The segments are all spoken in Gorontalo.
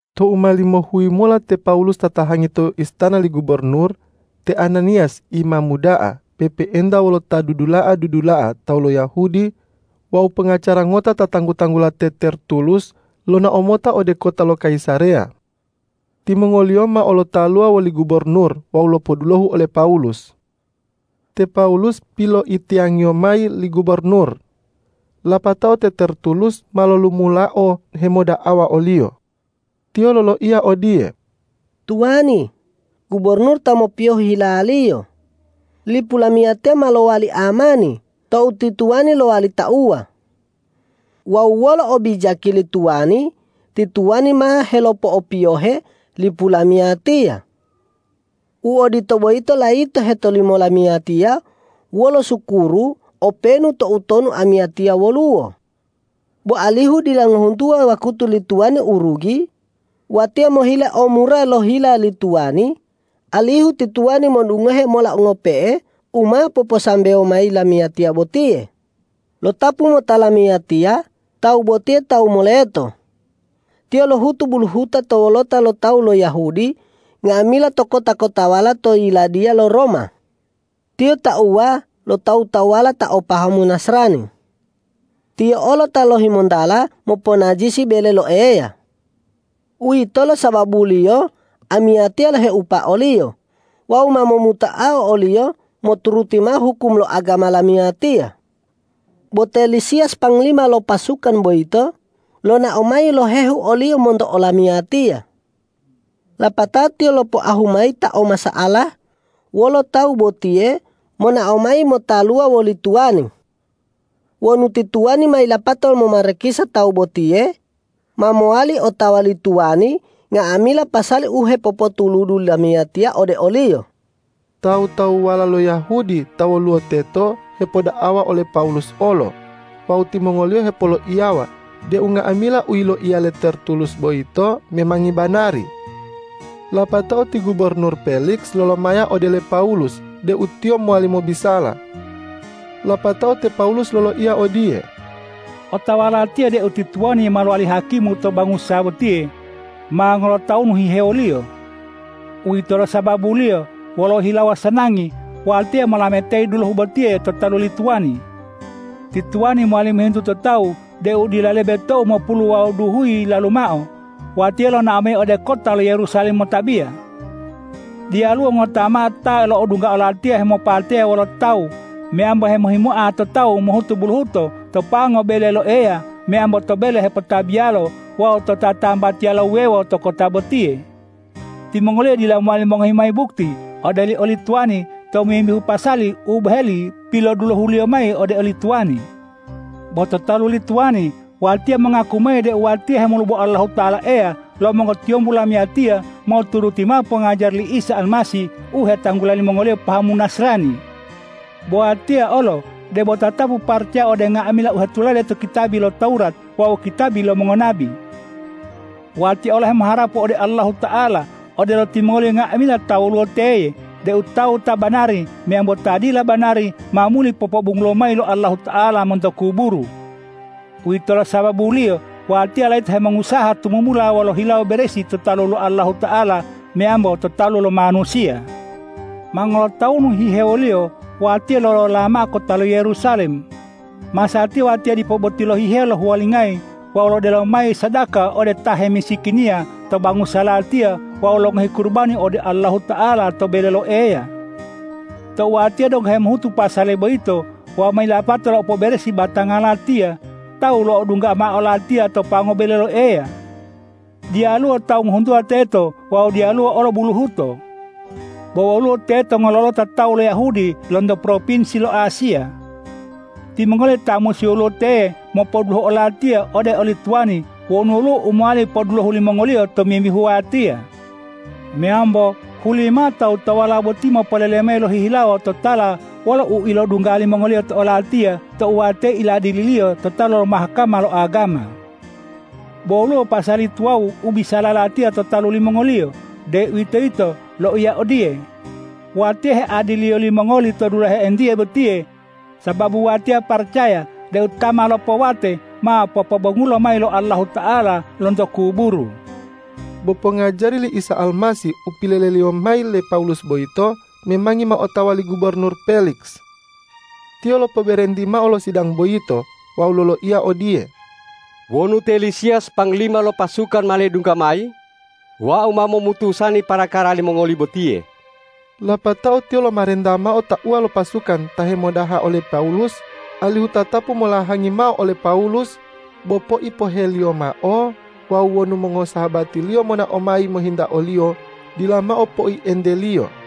Tou ma limohuyi mola te Pawulus tatahangi to istana li gubornur, te Ananiyas imamu da'a pe'epe'enta wolo ta dudula'a-dudula'a tawu lo Yahudi wawu pongacara ngota ta tanggu-tanggula te Tertulus, lonao mota ode kota lo Kayisareya. Timongoliyo mao lotaluwa woli gubornur wawu lopodulohu ole Pawulus. Te Pawulus piloitiyangiyo mayi li gubornur. Lapatao te Tertulus ma lolumulao hemoda'awa oliyo. Tiyo loloiya odiye,”Tuwani, gubornur ta mopiyohe hilaliyo, lipu lamiyatiya ma lowali amani tou ti tuwani lowali tauwa. Wawu wolo obijaki li tuwani ti tuwani ma helopo'opiyohe lipu lamiyatiya. U odito boyito layito hetolimo lamiyatiya wolo sukuru openu toutonu amiyatiya woluwo. Bo alihu dila ngohuntuwa wakutu li tuwani u rugi, watiya mohile o mura lo hila li tuwani, alihu ti tuwani modungohe mola ngope'e u ma poposambewo mayi lamiyatiya botiye. Lotapu mota lamiyatiya tawu botiye tawu moleto. Tiyo lohutu buluhuta to wolota lo tawu lo Yahudi nga'amila to kota-kotawala to yiladiya lo Roma. Tiyo tauwa lo tawu-tawuwala ta o pahamu Nasrani. Tiyo olo ta lohimontala moponajisi bele lo Eya. Uwitolo sababuliyo amiyatiya loheupa oliyo wawu ma momutoa oliyo moturuti mao hukum lo agama lamiyatiya. Bo te Lisiyas panglima lo pasukan boyito, lonao mayi lohehu oliyo monto olamiyatiya. Lapatao tiyo lopoahu mayi ta o masa'ala wolo tawu botiye monao mayi motaluwa woli tuwani. Wonu ti tuwani ma yilapato momarakisa tawu botiye, ma mowali otawa li tuwani nga'amila pasali u hepopotuludu lamiyatiya ode oliyo.” Tawu-tawuwala lo Yahudi ta woluwo teto hepoda'awa ole Pawulus olo wawu timongoliyo hepoloiyawa deu nga'amila u yiloiya le Tertulus boyito memangi banari. Lapatao ti gubornur Peliks lolomaya ode le Pawulus deu tiyo mowali mobisala. Lapatao te Pawulus loloiya odiye,”Otawa latiya deu ti tuwani ma lowali hakimu to bangusa botiye ma ngolotawunu hihewoliyo. Uwitolo sababuliyo wolo hilawo sanangi watiya molametayi dulohu botiye to talu li tuwani. Ti tuwani mowali mohintu to tawu deu dila lebe tou mopulu wawu duhuyi yilalu mao, watiya lonao mayi ode kota lo Yerusalem motabiya. Diyaluwo ngota mao ta lo'odungga olatiya hemopateya wolo tawu meyambo hemohimoa to tawu mohutu buluhuto to pango bele lo Eya meyambo to bele hepotabiyalo wawu to tatambatiyala wuwewo to kota botiye. Timongoliyo dila mowali mongohi mayi bukti ode oli tuwani tomimbihu pasali u boheli pilodulohuliyo mayi ode oli tuwani. Bo to talu li tuwani, watiya mongaku mayi deu watiya hemolubo Allahuta'ala Eya lo mongotiyombu lamiyatiya moturuti mao pongajari li Isa Almasih u hetanggula limongoliyo pahamu Nasrani. Bo watiya olo debo tatapu paracaya ode nga'amila u hetulade to kitabi lo Tawurat wawu kitabi lo mongonabi. Watiya olo hemoharapu ode Allahuta'ala, odelo timongoliyo nga'amila ta woluwo teye, deu tawu ta banari meyambo ta dila banari ma muli popobongulo mayi lo Allahuta'ala monto kuburu. Uwitolo sababuliyo watiya layito hemongusaha tumumula wolo hilawo beresi to talu Allahuta'ala meyambo to talu lo manusiya. Ma ngolotawunu hihewoliyo watiya lolola mao kota lo Yerusalem. Masatiya watiya dipo boti lohihewo lohuwalingayi wawu lodelo mayi sadaka ode ta hemisikiniya to bangusa latiya wawu longohi kurubani ode Allahuta'ala to bele lo Eya. Tou watiya donggo hemohutu pasali boyito wawu ma yilapato lo po'oberesi batanga latiya, tawu lo'odungga mao olatiya to pango bele lo Eya. Diyaluwo tawu ngohuntuwa teto wawu diyaluwo olo buluhuto. Bo woluwo teto ngololota tawu lo Yahudi lonto propinsi lo Asiya. Timongoliyo ta musi woluwo teye mopodulohu olatiya ode oli tuwani wonu woluwo u mowali podulohu limongoliyo tomimbihu watiya. Meyambo huli mao tawu-tawuwala boti mopolele mayi lohihilawo totala wolo u ilodungga limongoliyo to olatiya tou watiya iladililiyo to talu lo Mahkama lo agama. Bo woluwo pasali tuwawu u bilisala latiya to talu limongoliyo, deuwitoyito loiya odiye, ’Watiya headiliyo limongoli to dulahe entiye botiye, sababu watiya paracaya deu ta ma lopowate ma popobongulo mayi lo Allahuta'ala lonto kuburu.’” Bo pongajari li Isa Almasih u pilolele mayi le Pawulus boyito memangi ma otawa li gubornur Peliks. Tiyo lopoberenti mao lo sidang boyito wawu loloiya odiye,”Wonu te Lisiyas panglima lo pasukan ma ledungga mayi, wau ma momutusani parakara limongoli botiye.” Lapatao tiyo lomarenta mao tauwa lo pasukan ta hemodaha ole Pawulus alihu tatapu molahangi mao ole Pawulus, bo poipo'oheliyo mao wawu wonu mongosahabatiliyo monao mayi mohinta oliyo, dila mao poienteliyo.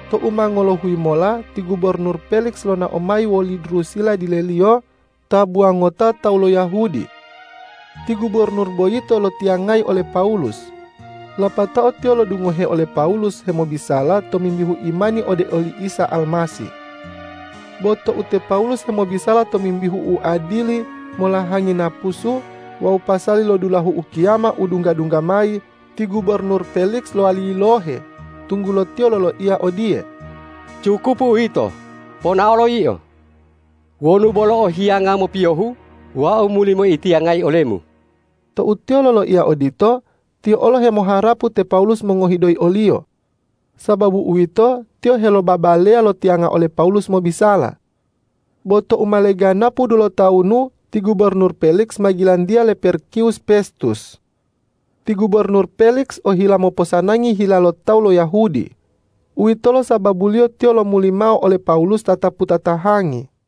Tou ma ngolohuyi mola ti gubornur Peliks lonao mayi woli Drusila dileliyo, tabuwa ngota tawu lo Yahudi. Ti gubornur boyito loitiyangayi ole Pawulus, lapatao tiyo lodungohe ole Pawulus hemobisala tomimbihu imani ode oli Isa Almasih. Bo tou te Pawulus hemobisala tomimbihu uadili, molahangi napusu wawu pasali lo dulahu ukiyama u dungga-dungga mayi, ti gubornur Peliks lowali yilohe, tunggulo tiyo loloiya odiye,”Cukupu uwito, ponaolo yio. Wonu bolo o hiyanga mopiyohu, wau muli moitiyangayi olemu.” Tou tiyo loloiya odito, tiyo olo hemoharapu te Pawulus mongohi doyi oliyo. Sababu uwito, tiyo helobabaleya lotiyanga ole Pawulus mobisala. Bo tou ma leganapu dulotawunu, ti gubornur Peliks ma gilantiya le Perkiwus Pestus. Ti gubornur Peliks ohila moposanangi hila lo tawu lo Yahudi. Uwitolo sababuliyo tiyo lomuli mao ole Pawulus tatapu tatahangi.